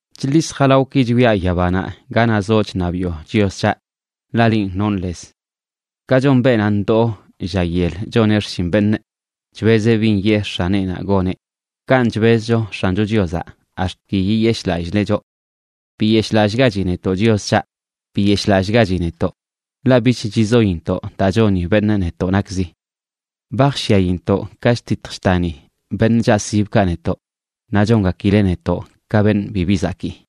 Chḻis jalawꞌki chwiaꞌ yabanaꞌ ganaꞌ zoꞌ chṉabiꞌo, Chios c̱haꞌ, ḻaꞌ linꞌ nonꞌ lez. Ka chon beenaꞌ ndoo lla yel choneꞌ xshin beṉꞌ chbezeꞌ bin yee x̱aneꞌnaꞌ goneꞌ, kanꞌ chbezcho X̱ancho Chiozaꞌ ax̱t ki yiyeshꞌlallileꞌ choꞌ. Biyeshꞌlallꞌgachi netoꞌ, Chios c̱haꞌ, biyeshꞌlallꞌgachi netoꞌ, ḻaꞌ bich chizointoꞌ daa choni beṉꞌ netoꞌ nakzi. Ba jshyaintoꞌ ka chtitj chtani beṉꞌ chaꞌsibkaꞌ netoꞌ, naꞌ chongakileꞌ netoꞌ ka beṉꞌ bibi zakii.